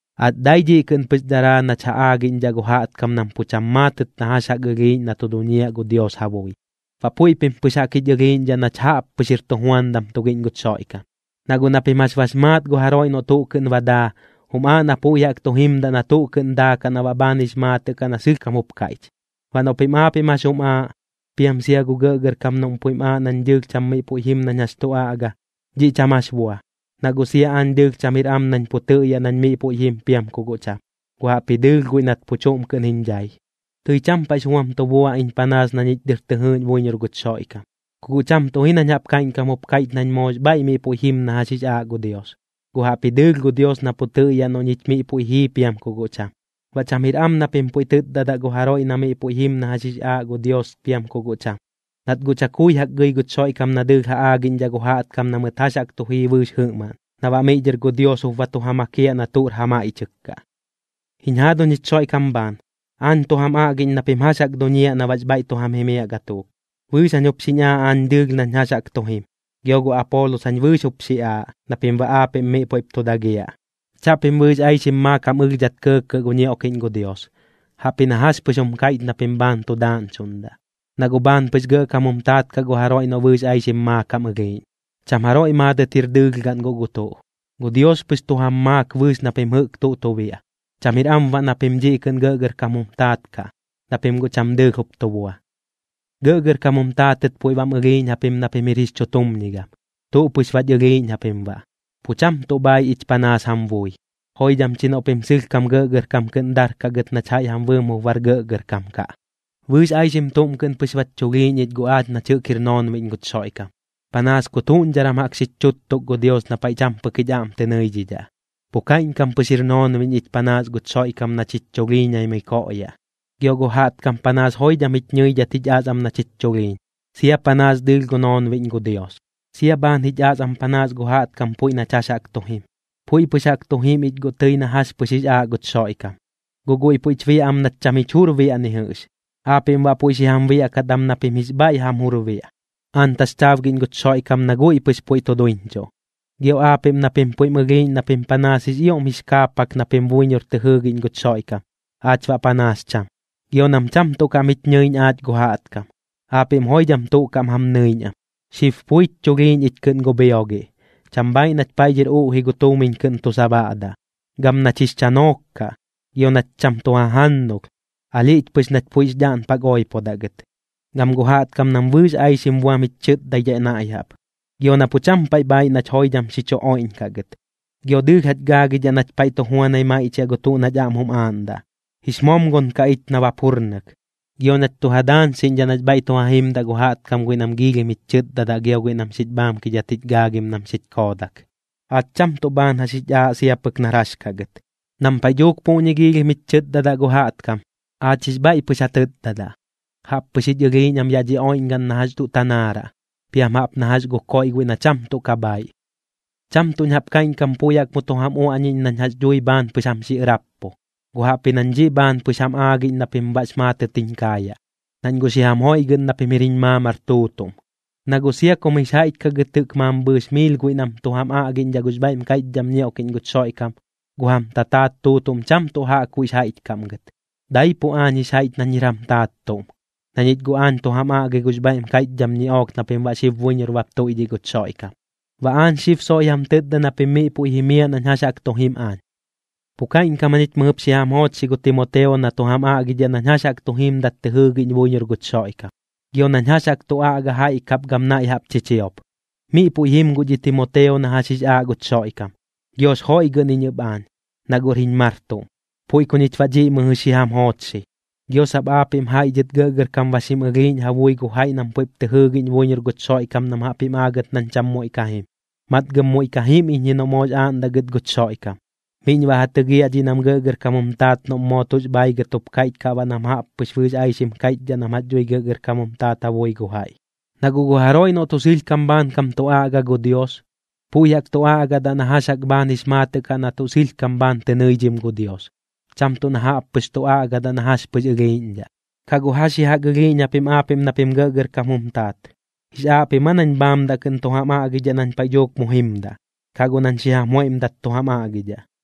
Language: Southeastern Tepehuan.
Aach dai dhiꞌ kɨꞌn pɨx daraa nach ja aagiꞌñdhaꞌ gu jaꞌtkam nam pu cham maatɨt na jax jaꞌk ɨlhiiꞌñ na tu duñiaꞌ gu Dios ja bui. Baꞌ puiꞌ pim pɨx jaꞌk jich ɨlhiiꞌñdhaꞌ nach jaꞌppɨx jir tujuandam tugiꞌñ guch Xoiꞌkam. Na guꞌ na pim jax bax maat gu jaroiꞌ noꞌ tuꞌ kɨꞌn ba daa, jum aaꞌ na puiꞌ jaꞌk tu jimdaꞌ na tuꞌ kɨꞌn daakaꞌ na baꞌ bhaan jix maatɨꞌ kaꞌ na sɨlhkam jup kaiꞌch. Baꞌ noꞌ pim aapiꞌm jax jum aaꞌ, piam sia gu gɇꞌgɇrkam noꞌm puiꞌm aaꞌ nañ dɨɨlh cham miꞌ puiꞌ jim nañ jax tu aꞌga, dhiꞌ cham jax bua, na guꞌ sia aañ dɨɨlh cham jir am nañ pu tɨꞌyaꞌ nañ miꞌ puiꞌ jim piam ku guꞌ cham, guꞌ jaꞌpji dɨɨlh guiꞌ nat pu chuꞌm kɨꞌn jiñ dhai. Tɨi cham paiꞌx buam tu bua iñ panaas na ñich dɨr tɨ jɨɨꞌñ buiñor guch Xoiꞌkam, ku guꞌ cham tuꞌ ji nañ jaꞌp kaiꞌñkam jup kaiꞌch nañ moox bhaiꞌ miꞌ puiꞌ jim na jax jix aaꞌ gu Dios, guꞌ jaꞌpji dɨɨlh gu Dios na pu tɨꞌyaꞌ noꞌ ñich miꞌ puiꞌ jii piam ku guꞌ cham. Baꞌ cham jir am na pim puiꞌ tɨtdadaꞌ gu jaroiꞌ na miꞌ puiꞌ jim na jax jix aaꞌ gu Dios piam ku guꞌ cham, nat guꞌ chakui jaꞌk gɨi guch Xoiꞌkam na dɨɨlh ja aagiꞌñdhaꞌ gu jaꞌtkam na mɨt jax chu jii bɨɨx jɨꞌmaꞌn, na baꞌ miꞌ dhɨr gu Dios jup ba tu ja makiaꞌ na tuꞌr ja maiꞌchɨk kaꞌ. Jiñ jaaduñ jich Xoiꞌkam bhaan, aañ tu jam aꞌgiꞌñ na pim jax jaꞌk duñiaꞌ na baꞌx bhaiꞌ tu jam jimiaꞌ gatuuk. Bɨɨx jañ jup xiñ aaꞌ aañ dɨɨlh nañ jax jaꞌk tu jim, gio gu Apoolos jañ bɨɨx jup xi aaꞌ, na pim baꞌ aapiꞌm miꞌ puiꞌp tu dagiaꞌ. Chaꞌpim bɨɨx aixim maakam ɨlhdhat kɇɇkɇꞌ gu ñioꞌkiꞌñ gu Dios, jaꞌpji na jax pɨx jum kaiꞌch na pim bhaan tu daaꞌñchuꞌndaꞌ, na guꞌ bhaan pɨx gɇꞌkam jum taat kaꞌ gu jaroiꞌ noꞌ bɨɨx aixim maakam ɨlhiiꞌñ. Cham jaroiꞌ maadɨt jir dɨɨlh gaꞌn guꞌ gu tuꞌ, gu Dios pɨx tu jam maak bɨɨx na pim jɨꞌk tuꞌ tu biaꞌ. Cham jir am baꞌ na pim dhiꞌ kɨꞌn gɇꞌgɇrkam jum taat kaꞌ, na pim guꞌ cham dɨɨlh jup tu bua. Gɇꞌgɇrkam jum taatɨt puiꞌ bam ɨlhiiꞌñ japim na pim jir jix chutumñigam, tuꞌ pɨx bach ɨlhiiꞌñ japim baꞌ, pu cham tuꞌ bhaiꞌ ich panaas jam bui. Joidham chi noꞌ pim sɨlhkam gɇꞌgɇrkam kɨꞌn darkaꞌ gɨt nach jaiꞌ jam bɨɨm jup bar gɇꞌgɇrkam kaꞌ. Bɨɨx aixim tuꞌm kɨꞌn pɨx bach chulhiiñ ich guꞌ aach nach jɨꞌk jir noonbiꞌñ guch Xoiꞌkam, panaas kut juꞌñdharam jaꞌk xich chuttuk gu Dios na paiꞌ cham pɨk jich aꞌm tɨ nɨidhidhaꞌ. Pu kaiꞌñkam pɨx jir noonbiꞌñ ich panaas guch Xoiꞌkam nach jich chulhiiñaimɨi koꞌyaꞌ. Gio gu jaꞌtkam panaas joidham jich ñɨidhat jich as am nach jich chulhiiñ, sia panaas dɨɨlh gu noonbiꞌñ gu Dios. Sia bhaan jich as am panaas gu jaꞌtkam puiꞌ nach jax jaꞌk tu jim. Puiꞌ pɨx jaꞌk tu jim ich guꞌ tɨi na jax pɨx jix aaꞌ guch Xoiꞌkam, guꞌ guiꞌ puiꞌch biaꞌ am nach cham jich jur biaꞌ ni jɨꞌx. Aapiꞌm baꞌ puiꞌ xi jam biaꞌkat am na pim jix bhaiꞌ jam jur biaꞌ, aañ taxchaabgiꞌñ guch Xoiꞌkam na guiꞌ pɨx puiꞌ tu duiñchuꞌ. Gio aapiꞌm na pim puiꞌm ɨlhiiꞌñ na pim panaas jix ioꞌm jix kaapak na pim buiñor tɨ jɨɨgiꞌñ guch Xoiꞌkam, aach baꞌ panaas cham. Gio nam cham tuꞌ kaꞌm jich ñɨiꞌñ aach gu jaꞌtkam, aapiꞌm joidham tuꞌ kaꞌm jam nɨiꞌñ am. Xib puich chulhiiñ ich kɨꞌn gu bhiogiꞌ, cham bhaaiꞌ nach paiꞌ dhɨr uꞌji gu tuumiñ kɨꞌn tu sabaꞌdaꞌ, gam nach jix chanook kaꞌ. Gio nach cham tu jajannulh, alhiꞌch pɨx nach puiꞌx dhaꞌnpak oipodaꞌ gɨt. Gam gu jaꞌtkam nam bɨɨx aixim buam jich chɨtdaidhaꞌ naiꞌ jaꞌp. Gio na pu cham paiꞌ bhaaiꞌ nach joidham xi chu oiꞌñkaꞌ gɨt. Gio dɨɨlh jach gaagidhaꞌ nach paiꞌ tu juanai maiꞌchiaꞌ gu tuꞌ nach aꞌm jum aaꞌndaꞌ, jix momgon kaꞌ ich nabap jurnɨk. Gio nach tu ja daañxiꞌñdhaꞌ nax bhaiꞌ tu ja jimdaꞌ gu jaꞌtkam guiꞌ nam giilhim jich chɨtdadaꞌ gio guiꞌ nam xich bhaamkidhat jich gaagim nam xich koodak. Aach cham tuꞌ bhaan jax jich aaꞌ sia pɨk nar jax kaꞌ gɨt. Nam paiꞌ dhuuk puꞌñi giilhim jich chɨtdadaꞌ gu jaꞌtkam, aach jix bhaiꞌ pɨx ja tɨtdadaꞌ. Jaꞌppɨx jich ɨlhiiꞌñ am yaꞌ dhi oiꞌñgaꞌn na jax tuꞌ tanaaraꞌ, piam jaꞌp na jax gu koiꞌ guiꞌ na cham tuꞌ ka bhaaiꞌ. Cham tuꞌñ jaꞌp kaiꞌñkam puiꞌ jaꞌk mu tu jam uaꞌñiꞌñ nañ jax dhui bhaan pɨx jam xi ɨrappu, guꞌ jaꞌpji nañ dhiꞌ bhaan pɨx jam aagiꞌñ na pim baꞌx maatɨt jiñ kaayaꞌ, nañ guꞌ xi jam joiꞌgɨꞌn na pim jir jiñ maamar tuutuꞌm. Na guꞌ sia kum jix jaiꞌch kaꞌ gɨt jɨꞌk mambhɨɨx miil guiꞌ nam tu jam aꞌgiꞌñdhaꞌ gux bhaiꞌm kaiꞌchdham ñioꞌkiꞌñ guch Xoiꞌkam, gu jam tataat tuutuꞌm cham tuꞌ jaꞌkbuiꞌx jaiꞌch kaꞌm gɨt. Daipuꞌ aañ jix jaiꞌch nañ jir jam taat tuꞌm, na ñich guꞌ aañ tu jam aꞌgi gux bhaiꞌm kaiꞌchdham ñiꞌook na pim baꞌ xib buiñor bap tuiꞌdhiꞌ guch Xoiꞌkam. Baꞌ aañ xib soiꞌ jam tɨtda na pim miꞌ puiꞌ jimiaꞌ nañ jax jaꞌk tu jim aañ. Pu kaiꞌñkam jañich mɨjɨp xi jam joochxi gu Timoteo na tu jam aꞌgidhaꞌ nañ jax jaꞌk tu jimdat tɨ jɨɨgiꞌñ buiñor guch Xoiꞌkam, gio nañ jax jaꞌk tu aꞌga jaiꞌ kap gam naiꞌ jaꞌp chichiop. Miꞌ puiꞌ jim guꞌ dhi Timoteo na jax jix aaꞌ guch Xoiꞌkam, giox joiꞌgɨꞌn iñ ɨp aañ, na guꞌr jiñ mar tuꞌm, puiꞌ ku ñich baꞌ dhiꞌ mɨjɨ xi jam joochxi. Gio sap aapiꞌm jaiꞌ dhɨt gɇꞌgɇrkam ba xim ɨlhiiꞌñ ja bui gu jaiꞌ nam puiꞌp tɨ jɨɨgiꞌñ buiñor guch Xoiꞌkam nam jaꞌp jim aagɨt nañ cham muiꞌ ka jim. Matgɨm muiꞌ ka jim iñ ji noꞌ moox aaꞌndaꞌ gɨt guch Xoiꞌkam, miꞌñ baꞌ ja tɨgiaꞌ dhiꞌ nam gɇꞌgɇrkam jum taat noꞌm moo tuꞌx bhaigɨt jup kaiꞌch kaꞌ baꞌ nam jaꞌp pɨx bɨɨx aixim kaiꞌchdhaꞌ nam jax dhui gɇꞌgɇrkam jum taat ja bui gu jaiꞌ. Na guꞌ gu jaroiꞌ noꞌ tuꞌ sɨlhkam bhaankam tu aꞌga gu Dios, puiꞌ jaꞌk tu aꞌgadaꞌ na jax jaꞌk bhaan jix maatɨꞌ kaꞌ na tuꞌ sɨlhkam bhaan tɨ nɨidhim gu Dios, cham tuꞌ na jaꞌp pɨx tu aꞌgadaꞌ na jax pɨx ɨlhiiꞌñdhaꞌ. ¿Ku guꞌ jax ji jaꞌk ɨlhiiꞌñ japim aapiꞌm na pim jɨꞌk gɇꞌgɇrkam jum taat? ¿Jix aaꞌ pim aa nañ bhaamdaꞌ kɨꞌn tu jam aꞌgidhaꞌ nañ paiꞌ dhuuk mu jimdaꞌ, kaꞌ guꞌ nañ xi jam joiꞌmdat tu jam aꞌgidhaꞌ?